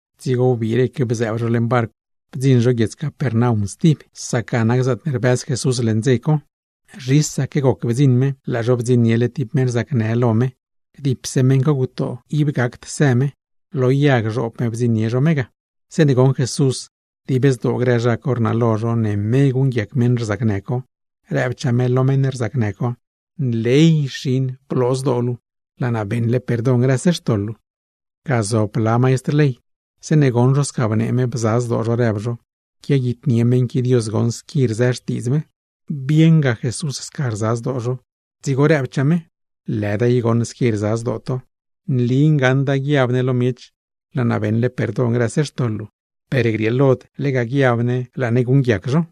Dzigo wbiireque bzëëb zho leṉ barcw, bdziṉ zho guiedz Capernaum stib, sac ga nac zaatne rbëz Jesús leṉ dze co. Zhisaque goc bdziṉ me, laa zho bdziṉniele tib meṉ rzacnë lo me, dipse meṉ co gutoo, ib gacd së me. Lo yag zhoob me bdziṉnie zho me ga. Zeeṉe goṉ Jesús dib zdoo grë zha co rnalo zho ne me guṉguiac meṉ rzacnë co, rëbchaa me lo meṉ rzacnë co: ―¡Nley bloo zdoo luu xin! ¡Laa naa beṉle perdon grëse xtoḻ luu! Ga zob blalaa maistr ley, zeeṉe goṉ zho sca bnee me, bza zdoo zho rëb zho: “¡Quiaguitnie meṉ qui Dios goṉ squi rzë xtiidz me!” Bieṉga Jesús sca rza zdoo zho, dzigo rëbchaa me: ―Lëda i goṉ squi rza zdoo to. Nli ngaṉda guiab ne lo miech: “Laa naa beṉle perdon grëse xtoḻ luu”; per grieelod lega guiab ne laa ne guṉguiac zho.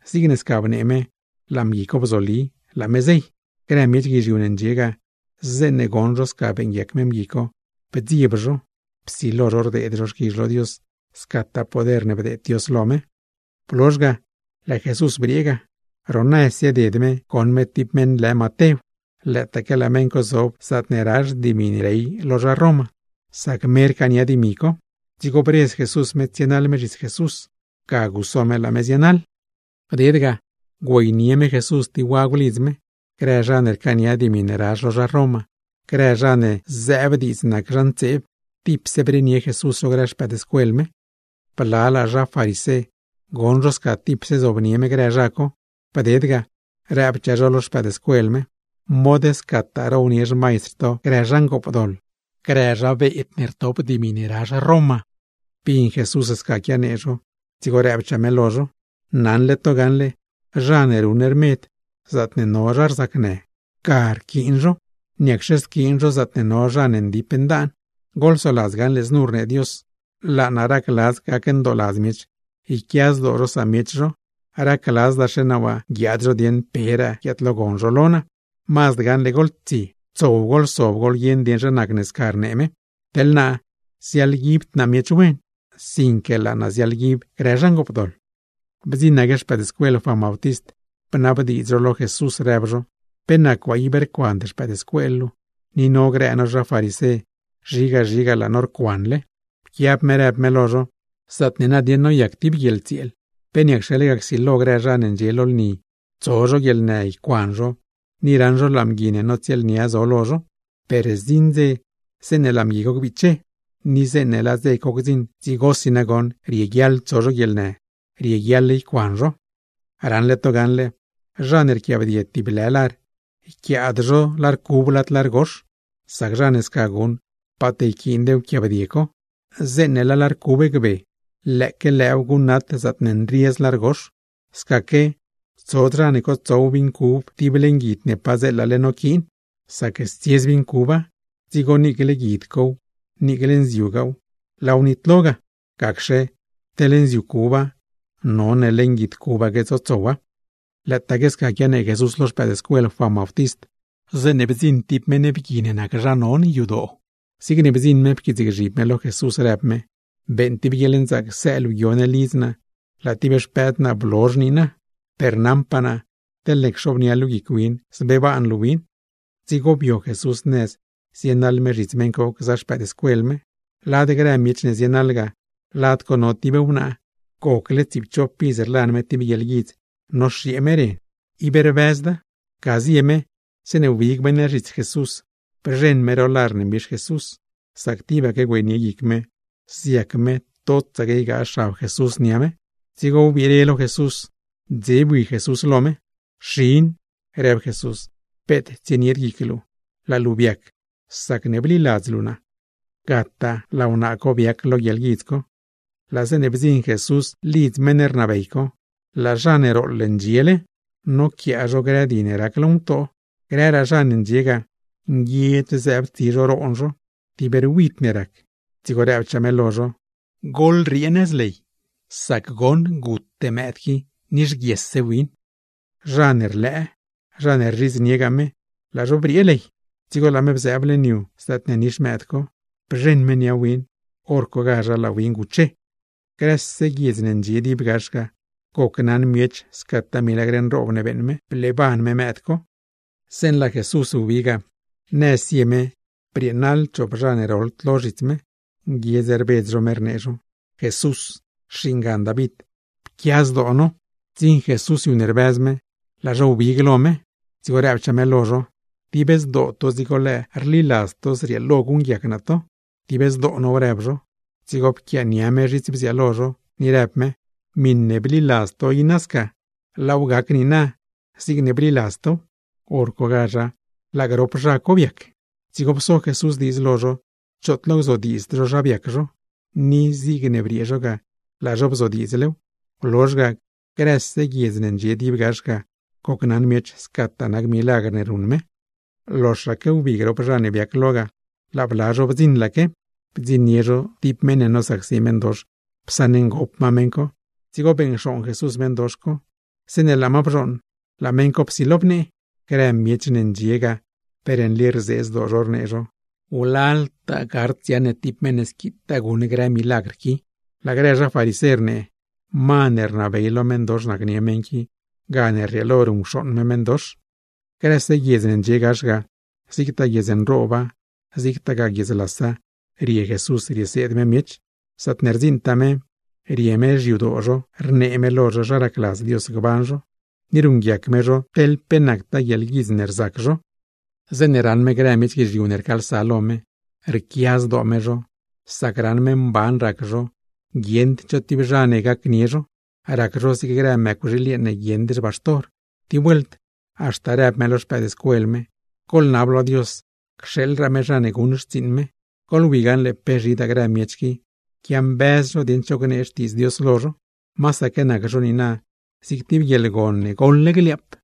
Zigne sca bnee me, laa mgui co bzoli, laa me zey. Grë miech guizhiu ne ndxie ga, zeeṉe goṉ zho sca beeṉguiac me mgui co, bdzieb zho. Psilo zho rdeed zho xquizh lo Dios, scataa poder ne bdeed Dios lo me. Blozh ga laa Jesús briee ga. Ro nëz zieded me goṉ me tib meṉ lë Matew, lëëtaque laa meṉ co zob lo mezh zaatne razh dimi ne rey lo zha Roma; sac me rcaania dimi co. Dzigo bredz Jesús me tsienaḻ me zhits Jesús. Ga guso me, laa me zienaḻ. Bded ga güeynie me Jesús tib wagw lidz me. Grë zha ne rcaania dimi ne razh lo zha Roma, grë zha ne zëëb diidz nac zha ntseeb, tipse brenie Jesús zho grë xpëëdscuel me. Blalaa zha farisé, goṉ zho sca tipse zobnie me grë zha co, bded ga, rëbchaa zho lo xpëëdscuel me: ―¡Mod scataa na rownie xmaistr to grë zha ngoopdoḻ, grë zha beed ne nac recaudador! Bin Jesús sca quianee zho, dzigo rëbchaa me lo zho: ―Naṉle to gaṉle, zha ne ruṉ rmed, zaatne no zha rzacnë ga rquiin zho, ¿niacxe squiin zho zaatne no zha ne ndip ndaan? Goḻsoladz gaṉle znu rnee Dios: “Laa naa racladz gacndooladz miech, yquia zdoo zho samiech zho, racladzdaxe naa waa guiaad zho dieeṉ peraa guiaadlogon zho lo naa.” Mazd gaṉle goḻtsie, tsow goḻsob goḻguieṉ dieṉ zha nacne sca rnee me. Teḻ naa, ziaḻguibd naa miech wen, sinque laa naa ziaḻguib grë zha ngoopdoḻ. Bdziṉaque xpëëdscuel Juan Bautist, bnabdiidz zho lo Jesús, rëb zho: ―¿Pe nac waa ib rcuand xpëëdscuel luu? Ni no grë no zha farisé, zhiga zhiga laa no rcuanle. Pquiab me rëb me lo zho: ―Zaatne nadieṉ noyac tib guieḻtsieel, ¿pe niacxe lega csilo grë zha ne ndxie lo lni tso zho guieḻnë, ycuan zho, ni raṉ zho laa mgui ne notsieelnia zo lo zho? Per zdziṉ dze zeeṉe laa mgui co gbiche, ni zeeṉe laa dze co gdziṉ, dzigosi nagoṉ rieguiaḻ tso zho guieḻnë, rieguiaḻ ycuan zho. ’Raṉle to gaṉle, zha ne rquiaabdie tib lë lar, yquiaad zho lar cub lad lar gox, sac zha ne sca guṉ paat yquiind wquiaabdie co. Zeeṉe laa lar cub gbe, lëëque lëëw guṉnat zaatne nriez lar gox. Scaque tsod zha ne cotsow vin cub tib leṉ guid ne padzeela noquiin, sac stsiez nziu cuba; dzigo niicle guid cow, niicle nziugaaw laaw nitlo ga. Gacxe, teḻ nziu cuba none leṉ guid cubaque tsotsowa. Lëëtaaque sca quianee Jesús lo xpëëdscuel Juan Bautist, zeeṉe bdziṉ tib mgui ne nac zha non yadoo. Zigne bdziṉ me pquiitsgzhib me lo Jesús, rëb me: ―Beeṉ tib guieḻnzaac së luu guio ne lidz naa. Laa tib xpëdwnaa naa blozh niina, per naṉpaa naa teḻne cxobnia luu guic win, zbeeban luu win. Dzigo bio Jesús nëz zienaḻ me zhits meṉ co, gza xpëëdscuel me. Lad grë miech ne zienaḻ ga, lad co no tib meṉ wnaa, gocle tsiipchop iz rlan me tib guieḻguidz, rzac me zigne rzac grë meṉ wnaa gzob mëë, tibaque rlan mew ib rbëzda. Ga zie me, zeeṉe wbig me nëz zhits Jesús, bzheṉ me ro lar ne mbix Jesús, sac tibaque güeynie guic me, ziac me totsaque ygaa xab Jesús nia me. Dzigo wbire lo Jesús, dze bui Jesús lo me. ―Xin ―rëb Jesús―, peet tsienied guic luu. Laa luu biac sacne bliladz luu naa. Gataa laa wnaa co biac lo guieḻguidz co. Laa zeeṉe bdziṉ Jesús lidz meṉ rnabey co, laa zha ne rooḻ ndxiele, noquiaa zho grë di ne rac lo ngutoo, grëraa zha ne ndxie ga, nguiedz zëëb tsi zho roon zho, tib ruid ne rac. Dzigo rëbchaa me lo zho: ―Goḻriee nëz ley, sac goṉ gute mëëd qui, nixguiesse win. Zha ne rlëë, zha ne rzhidzniegaa me, laa zho briee ley. Dzigo laa me bzëëb leṉ yu zaatne nix mëëd co, bzheṉ me nia win. ¡Horcogazha laa win guche! Grëse guiedz ne ndxie dib gax ga, gocnaṉ miech scataa milagr nroob ne beeṉ me, bleeban me mëëd co. Zeeṉe laa Jesús wbi ga, nëz zie me brieenaḻ chop zha ne roḻd lo zhits me, nguiedz rbedz zho rnee zho: ―¡Jesús, xingan David, pquia zdoo no! Bdziṉ Jesús yu ne rbëz me, laa zho wbig lo me. Dzigo rëbchaa me lo zho: ―¿Dib zdoo to dzigo lëë rliladz to zrieelo guṉguiac naa to? ―Dib zdoo now ―rëb zho. Dzigo pquiaania me zhits bziaalo zho, ni rëb me: ―Miṉe bliladz to i nasca, laaw gac niina zigne bliladz tow. ¡Horcogazha laa lo grop zha co biac! Dzigo pso Jesús diidz lo zho choot lo gzodiidzd zho zha biac zho, ni zigne briee zho ga, laa zho bzodiidzlew. Blozh ga, grëse guiedz ne ndxie dib gax ga, gocnaṉ miech scataa nac milagr ne ruṉ me. Loxaque wbi grop zha ne biac lo ga, laa bla zho bdziṉlaque, bdziṉnie zho tib meṉ ne nosacsi meṉdox, psaṉngop ma meṉ co. Dzigo beṉcxooṉ Jesús meṉdox co, zeeṉe laa ma bzhooṉ laa meṉ co psilo bnee. Grë miech guizhiu ne ndxie ga, per nli rzee zdoo zho, rnee zho: ―¡Wlaltaa gard dziaṉ ne tib meṉ ne squitaa guṉ grë milagr qui! Laa grë zha farisé rnee: ―Ma ne rnabey lo meṉdox nacnie meṉ qui, gane rrieelo ruṉcxooṉ me meṉdox. Grëse guiedz ne ndxie gax ga, zigtaa guiedz nrooba, zigtagaa guiedz lasa rie Jesús rieseed me miech. Zaatne rdziṉtaa me, rie me xyadoo zho rnee me lo zho zha racladz Dios gban zho, ni ruṉguiac me zho teḻ pe nactaa guieḻguidz ne rzac zho. Zeeṉe raṉ me grë miech guizhiu ne rcaalsa lo me, rquia zdoo me zho, sac raṉ me mban rac zho guieṉd cho tib zha ne gacnie zho, rac zho zig grë mëcwxiil yeeṉ ne guieṉd xbaxtor. Tib vuelt haxta rëb me lo xpëëdscuel me: ―Goḻnab lo Dios cxeeḻraa me zha ne guṉ xtsiiṉ me. Goḻwi gaṉle pe zhidaa grë miech qui, quiambëz zho dieṉ cho gnee Xtiidz Dios lo zho. Masaque nac zho niina, zig tib guieḻgon ne goḻle gliaap.